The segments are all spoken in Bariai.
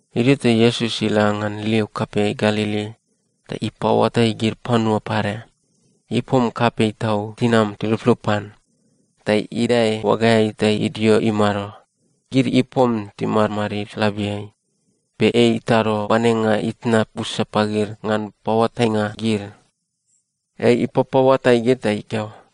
Idio ta Iesus ila ngan liu kapei Galili ta ipaoatai gid panua pade. Ipom kapei tau tinam tiluplup pan, ta idae oagaeai ta idio imado. Gid ipom timadmadid labiai, be ei itado oanenga itna busa pagid ngan paoatainga gid. Ei ipapaoatai gid ta ikeo,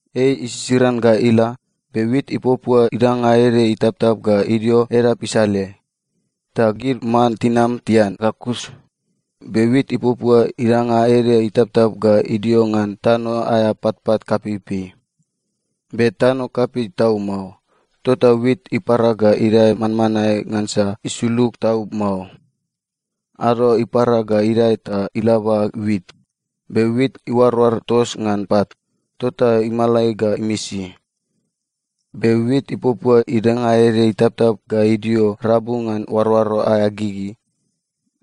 Ei isisiran ga ila, be wit ipuapua idanga ede itaptap ga idio edap isaleai. Ta gid man tinam tian ga kus. Be wit ipuapua idanga ede itaptap ga idio ngan tano aea patpat kapeipei. Be tano kapei tau mao, tota wit ipara ga idae manmanae ngansa isulug tau mao. Ado ipara ga idae ta ilaba wit. Be wit iuaroar tos ngan pat, tota imalai ga imisi. Be wit ipuapua idanga ede itaptap ga idio rabu ngan oaroaro aea gigi.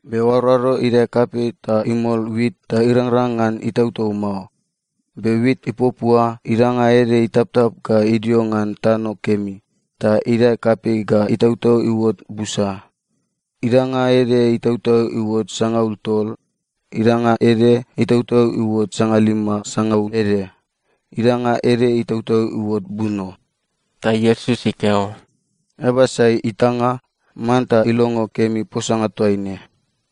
Be oaroaro idae kapei ta imol wit ta irangrang ngan itautau mao. Be wit ipuapua idanga ede itaptap ga idio ngan tano kemi, ta idae kapei ga itautau iuot busa. Idanga ede itautau iuot sangaul tol, idanga ede itautau iuot sangalima sangaul ede, idanga ede itautau iuot buno.” Ta Iesus ikeo, “Eaba sai itanga, manta ilongo kemi posanga toaine.”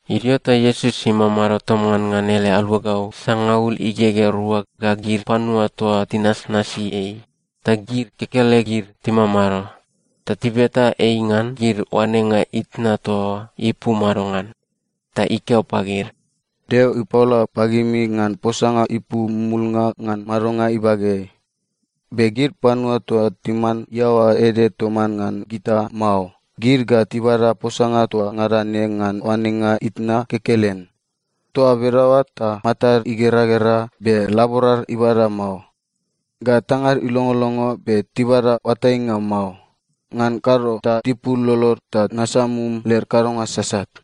Idio ta Iesus imamado toman ngan ele aluagau sangaul igegea rua ga gid panua toa tinasnasi ei, ta gid kekelegid timamado. Ta tibeta ei ngan gid oanenga itna toa oa ipu madongan. Ta ikeo pagid, “Deo ipaola pagimi ngan posanga ipu mumulnga ngan madonga ibageai. Be gid panua toa timan iaoa ede toman ngan gita mao, gid ga tibada posanga toa ngada ne ngan oanenga itna kekelen. Toa bedaoa ta, “‘Matad igeragera, be laborad ibada mao. Ga tangad ilongolongo, be tibada oatainga mao. Ngan kado ta tipul lolod ta nasamum led kadonga sasat.’”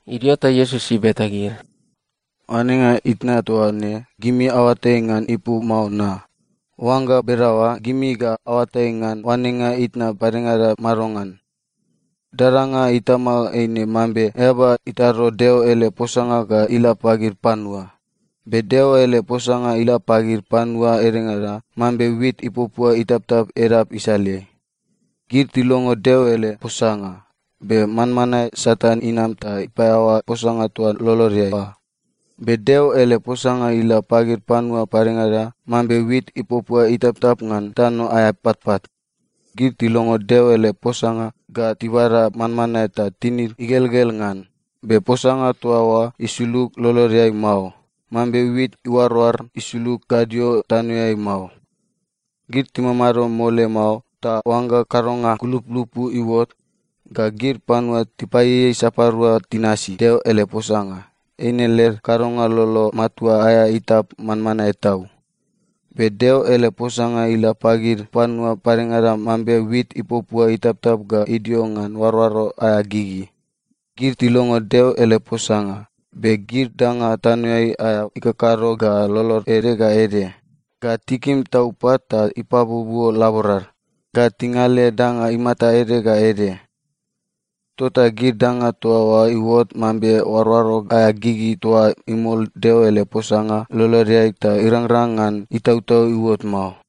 Idio ta Iesus ibeta gid, “Oanenga itna toa ne, gimi aoatai ngan ipu mao na? Oangga bedaoa, gimi ga aoatai ngan oanenga itna padengada madongan? Dadanga itama eine mambe eaba itado Deo ele posanga ga ila pagid panua. Be Deo ele posanga ila pagid panua edengada mambe wit ipuapua itaptap edap isaleai. Gid tilongo Deo ele posanga, be manmanae Satan inam ta ipaeaoa posanga toa lolodeai oa. Be Deo ele posanga ila pagid panua padengada mambe wit ipuapua itaptap ngan tano aea patpat. Gid tilongo Deo ele posanga ga tibada manmanae ta tinid igelgel ngan. Be posanga toa oa isulug lolodeai mao, mambe wit iuaroar isulug gadio tanoeai mao. Gid timamado mole mao, ta oangga kadonga kulupulupu iuot, ga gid panua tipaieiei sapadua tinasi Deo ele posanga, eine led kadonga lolo matua aea itap manmanae tau. Be Deo ele posanga ila pagid panua padengada mambe wit ipuapua itaptap ga idio ngan oaroaro aea gigi. Gid tilongo Deo ele posanga, be gid danga tanoeai aea ikakado ga lolod ede ga ede, ga tikim tau pat ta ipabuobuo laborad, ga tingale danga imata ede ga ede. Tota gid danga toa oa iuot mambe oaroaro aea gigi toa imol Deo ele posanga lolodeai ta irangrang ngan itautau iuot mao.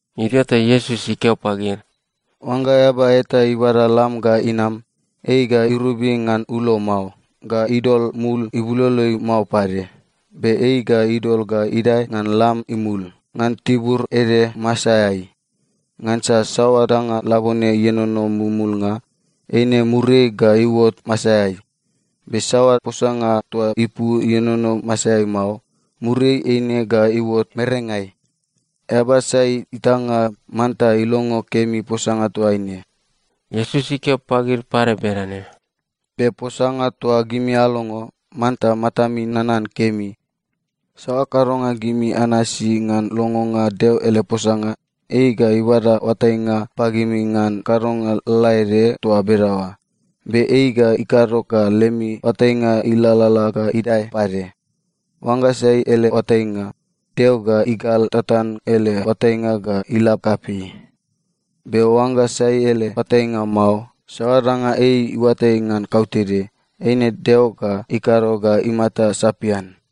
Idio ta Iesus ikeo pagid, “Oangga eaba eta ibada lam ga inam, ei ga irobi ngan ulo mao, ga idol mul ibuloloeai mao pade. Be ei ga idol ga idae ngan lam imul, ngan tibur ede masaeai. Ngansa saoa danga labone ienono mumulnga, eine muriai ga iuot masaeai. Be saoa posanga toa ipu ienono masaeai mao, muriai eine ga iuot merengai. Eaba sai itanga, manta ilongo kemi posanga toaine.” Iesus ikeo pagid pade bedane, “Be posanga toa gimi alongo, manta matami nanan kemi. Saoa kadonga gimi anasi ngan longonga Deo ele posanga, ei ga ibada oatainga pagimi ngan kadonga lalaede toa bedaoa, be ei ga ikado ga lemi oatainga ilalala ga idae pade. Oangga sai ele oatainga, Deo ga igal tatan ele oatainga ga ila kapei. Be oangga sai ele oatainga mao, saoa danga ei iuatai ngan kautede, eine Deo ga ikado ga imata sapian.”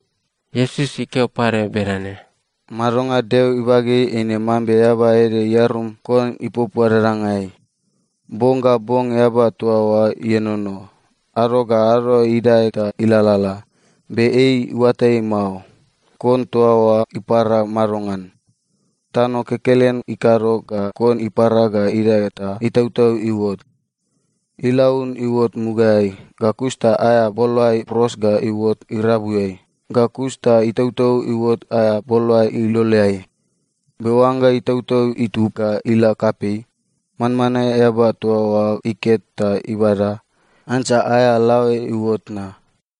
Iesus ikeo pade bedane, “Madonga Deo ibageai eine mambe eaba ede iarum kon ipuapua dadangai. Bong ga bong eaba toa oa ienono. Ado ga ado idae ta ilalala, be ei iuatai mao, kon toa oa ipara madongan. Tano kekelen ikado ga kon ipara ga idae ta itautau iuot. Ilaun iuot mugaeai, ga kus ta aea boloae pros ga iuot irabuiai, ga kus ta itautau iuot aea boloae iloleai. Be oangga itautau itub ga ila kapei, manmanae eaba toa oa iket ta ibada, ngansa aea laoe iuot na.”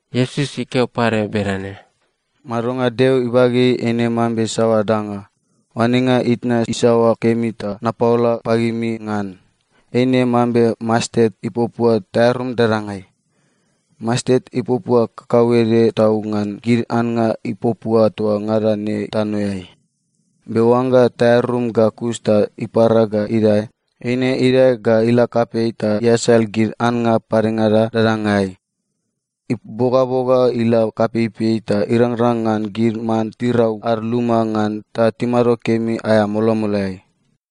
Iesus ikeo pade bedane, “Madonga Deo ibageai eine mambe saoa danga? Oanenga itna isaoa kemi ta napaola pagimi ngan? Eine mambe mastet ipuapua taearum dadangai. Mastet ipuapua kakauede tau ngan gid annga ipuapua toa ngada ne tanoeai. Be oangga taearum ga kus ta ipara ga idae, eine idae ga ila kapei ta iasal gid annga padengada dadangai. Ibogaboga ila kapeipei ta irangrang ngan gid man tirau ad luma ngan ta timado kemi aea molomoloeai.”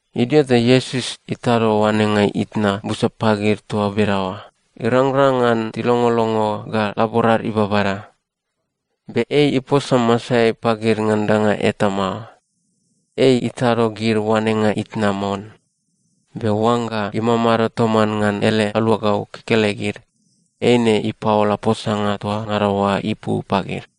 Idio ta Iesus itado oanenga itna busa pagid toa bedaoa, irangrang ngan tilongolongo ga laborad ibabada. Be ei iposa masaeai pagid ngan danga eta mao. Ei itado gid oanenga itna mon. Be oangga imamado toman ngan ele aluagau kekelegid, eine ipaola posanga toa ngada oa ipu pagid.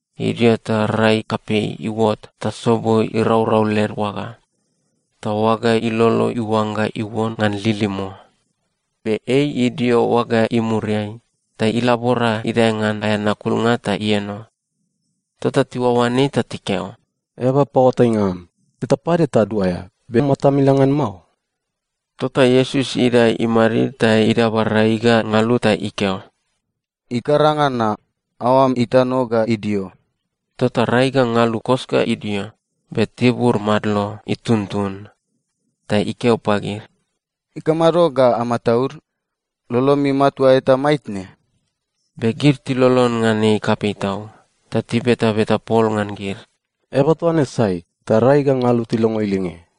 Idio ta rai kapei iuot ta sobo iraurau led oaga. Ta oaga ilolo iuangga iuon ngan lilimo. Be ei idio oaga imuriai, ta ilabora idae ngan aea nakulnga ta ieno. Tota tiuaoan ei ta tikeo, “Eaba paoatainga am, teta pade taduaea, be matam ila ngan mao?” Tota Iesus idae imadid ta idaba rai ga ngalu ta ikeo, “Ikaranga na! Aoam itano ga idio!” Tota rai ga ngalu kos ga idio, be tibur madlo ituntun. Ta ikeo pagid, “Ikamado ga amataud? Lolomi matua eta maitne?” Be gid tilolon ngan ei kapei tau, ta tibetabeta pol ngan gid, “Eaba toa ne sai, ta rai ga ngalu tilongo ilinge?”